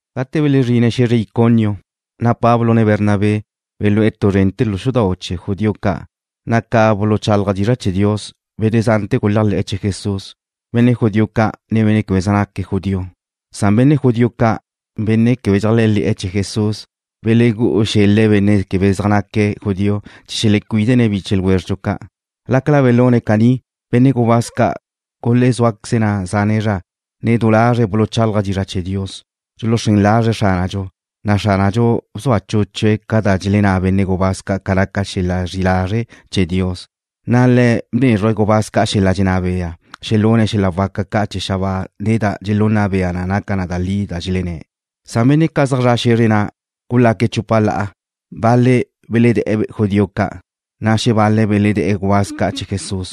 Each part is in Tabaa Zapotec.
Gate belezrin Pablo ne Bernabé xe̱zre Iconio, na' belú'e̱ tu zrente̱ lu xudau' chee̱ judío ca', na' ca buluchálaje̱' dizra' chee̱ Dios, benne' zante̱ guléajle̱'e̱ chee̱ Jesús, benne' judío ca', ne benne' quebe zaj naque̱' judío. Nadxa benne' judío ca', benne' quebe dxeléajle̱'e̱ chee̱ Jesús belegú'u xel-le̱' benne' quebe zaj naque̱' judío chee̱ xelecuídene̱' biche ljwézredxu ca'. Lácala belune̱' caní, benne' gubáz ca' gulezúaqueze̱' na' zane' zra, ne du lazre̱' buluchálaje̱' dizra' chee̱ Dios, dxuluxrén lazre̱' Xránadxu, na' Xránadxu bzua chúchue̱' ca da dxelenná benne' gubáz ca' ca naca xel-la' zri'i lazre' chee̱ Dios, na' Le̱' bnézruje̱' gubáz ca' xel-la' dxenná bea xelune̱' xel-la' waca ca' chee̱ xabáa ne da dxelunna bea na naca da li da dxelenné̱'. Benne' ca' zaj zre̱'e̱ xe̱zre na' gulaque̱' chupa la'a. Bal-le̱' beledé̱'e̱ judío ca', na' xebal-le̱' beledé̱'e̱ gubáz ca' chee̱ Jesús.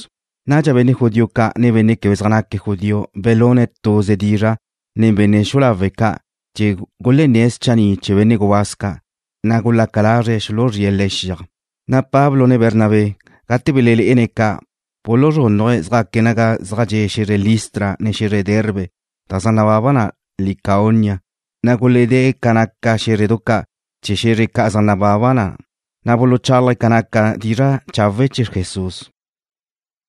Nadxa benne' judío ca', ne benne' quebe zaj naque̱' judío belune̱' tuze dizra' nen benne' xu'u lawe' ca' chee̱ gulenné̱' schanni' chee̱ benne' gubáz ca', na' gulaca lazre̱' xuluzríe̱' le̱' xiaj. Pablo ne Bernabé, gate belenne̱' ca', buluzrúnnaje̱' zjaque̱' naga zaj dxe' xe̱zre Listra, ne xe̱zre Derbe, da zaj nababa Licaonia, na' guledée̱' ca naca xé̱zredu ca' chee̱ xe̱zre ca' zaj nababa na', na' buluchálaje̱' na' ca naca dizra' chawe' chee̱ Jesús.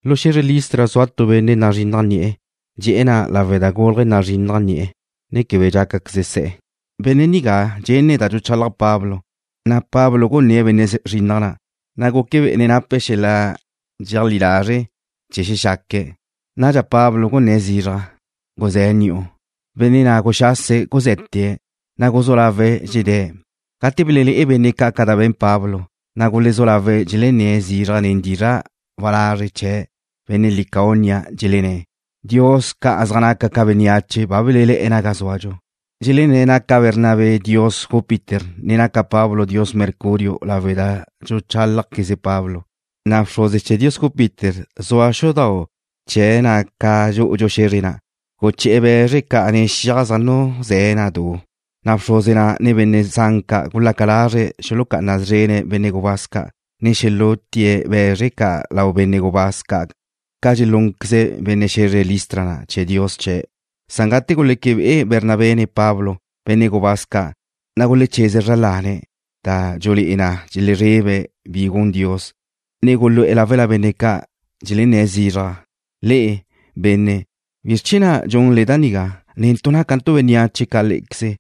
Lu xe̱zre Listra zua tu benne' nazrinnaj ni'e̱. Dxe'e̱ na' lawe' da gúlaje̱' nazrinnaj ni'e̱, ne quebe dxácaqueze se̱'e̱. Benne' nigá dxenne̱' da dxuchalaj Pablo, na' Pablo gunné̱'e̱ benne' zrinnaj na', na' guque bé'ene̱' nape̱' xel-la' dxeajlí lazre' chee̱ xexaque̱'. Nadxa Pablo gunné̱' zizraj: ―Guzé̱ ni'u. Benne' na' guxase̱' guze̱te̱', na' guzú lawe̱' dxedé̱'. Gate belelé'e benne' ca' da be̱n Pablo, na' gulezú lawe̱' dxelenné̱' zizraj nen dizra' walazre' chee̱ benne' Licaonia, dxelenné̱': ―Dios ca' zaj naca ca bénneache ba belelé̱'e̱ naga zúadxu. Dxelenné̱' naca Bernabé dios Júpiter, ne naca Pablo dios Mercurio lawe' da dxuchálajqueze Pablo. Na' bxruze chee̱ dios Júpiter, zua xudau' chee̱ na ca dxú'udxu xe̱zre na', guché̱'e̱ be̱zre ca' ne xiaj zaj nuzé̱'e̱ na du, na' bxruze na', ne benne' zan ca' gulaca lazre̱' xuluxucá'ana szrene̱' benne' gubáz ca', ne xelútie̱' be̱zr ca' lau benne' gubáz ca' ca dxelúnqueze benne' xe̱zre Listra na' chee̱ dios chee̱'. Gate guleque be'e Bernabé ne Pablo, benne' gubáz ca', na' gulecheze̱' zra lane̱' da dxulé'e na dxelezrebe̱' bi gun Dios, na' gulu'e̱ láwela benne' ca', dxelenné̱' zizraj: ―Le'e, benne', ¿bizr chee̱ na' dxunle da nigá? Netu' nácantu' bénneache ca lé'equeze,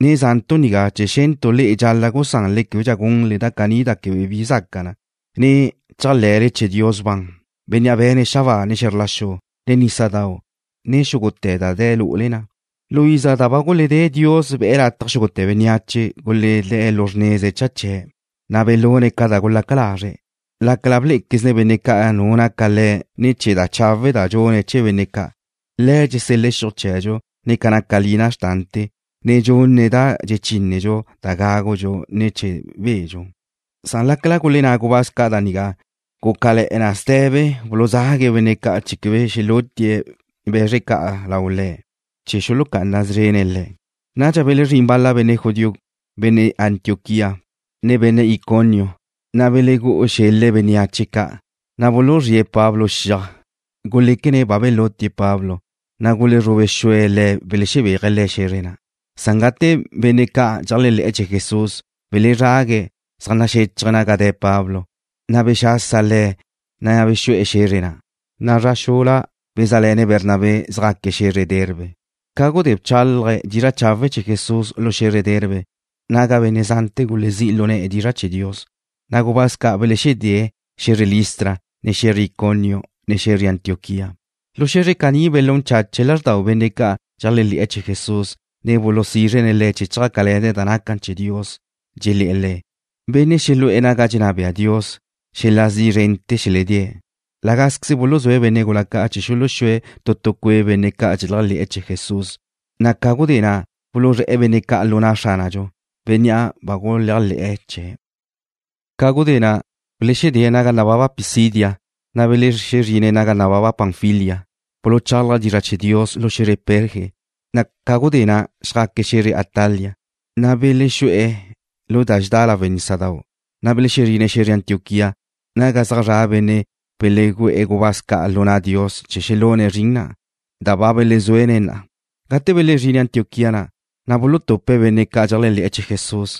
ne za'ntu' nigá chee̱ xe̱ntu' le'e dxal-la' gusanle québedxa gunle da caní da quebe bi zaca na, ne chéajle̱le chee̱ Dios ban, Bénnea' be̱ne̱' xabáa ne xe̱zr la xu, ne nísadau', ne xúgute̱ da de̱ lu'ule na. Lu iza da ba guledé Dios be̱'e̱ lataj xúgute̱ bénneache guledé̱' lu xrneza cha chee̱', na' belune̱' ca da gulaca lazre̱', lácala blé'equezne̱' benne' ca' nu naca Le̱' ne̱ chee̱ da chawe' da dxune̱' chee̱ benne' ca'. Le̱' dxusel-la' xiuj chee̱dxu ne ca naca lina xrtante̱, ne dxunne̱' da dxechínedxu da gágudxu, ne chee̱ bedxu. Lácala gulenná gubáz ca' da nigá, gúcale̱'e̱ na ste̱be buluzague̱' benne' ca' chee̱ quebe xelútie̱' be̱zr ca' lau le̱' chee̱ xuluxucá'ana szrene̱' le̱'. Gudé na' belezrín bal-la benne' judío, benne' Antioquía, ne benne' Iconio, na' belegú'u xel-le̱' bénneache ca', na' buluzríe̱' Pablo xiaj. Guléquene̱' ba belutie̱' Pablo, na' gulezrube xue̱' le̱' belebéaje̱' le̱' xe̱zre na'. Gate benne' ca' dxeléajle̱'e̱ chee̱ Jesús belezrague̱' zaj naxéchaje̱' naga de̱' Pablo, na' bexasa le̱', ne bexu'e̱ xe̱zre na', na' zra xula bezá'le̱ne̱' Bernabé, zjaque̱' xe̱zre Derbe. Ca gudé bchálaje̱' dizra' chawe' chee̱ Jesús lu xe̱zre Derbe, naga benne' zante̱ gulezí' lu ne̱'e̱ dizra' chee̱ Dios, na' gubáz ca' belexedée̱' xe̱zre Listra, ne xe̱zre Iconio, ne xe̱zre Antioquía. Lu xe̱zre caní belún chache̱' lázrdau benne' ca' dxeléajle̱'e̱ chee̱ Jesús, ne bulusízrene̱' le̱' chjácale̱ne̱' da naca chee̱ Dios, dxelé̱'e̱ le̱': ―Benne' xelu'e̱ naga dxenná bea Dios, xel-la' zi' zrente̱ xeledée̱'. La gázqueze buluzúe̱' benne' gula ca' chee̱ xuluxúe̱' tu tu cue' benne' ca' dxeléajle̱'e̱ chee̱ Jesús, na' ca gudé na' buluzré̱'e̱ benne' ca' lu na' Xránadxu, Bénnea' ba guléajle̱'e̱ chee̱'. Ca gudé na' belexedée̱' naga nababa Pisidia, na' belezrine̱' naga nababa Panfilia. Buluchálaje̱' dizra' chee̱ Dios lu xe̱zre Perge, na' ca gudé na' xjaque̱' xe̱zre Atalia. Na' belexú'e̱ da dxedá lawe' nísadau', na' belexezrine̱' xe̱zre Antioquía, naga zaj zra' benne' belegu'e̱ gubáz ca' lu na' Dios chee̱ xelune̱' zrin na', da ba belezuene̱' na'a. Gate belezrine̱' Antioquía na', na' bulutupe̱' benne' ca' dxeléajle̱'e̱ chee̱ Jesús,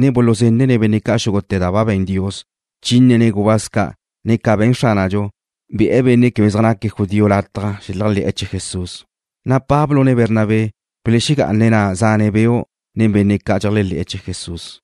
ne buluzenne̱' benne' ca' xúgute̱ da ba be̱n Dios, bchínene̱' gubáz ca', ne ca be̱n Xránadxu, be̱'e̱ benne' quebe zaj naque̱' judío lataj xeléajle̱'e̱ chee̱ Jesús. Na' Pablo, ne Bernabé belexegá'ane̱' na' zane' beu' nen benne' ca' dxeléajle̱'e̱ chee̱ Jesús.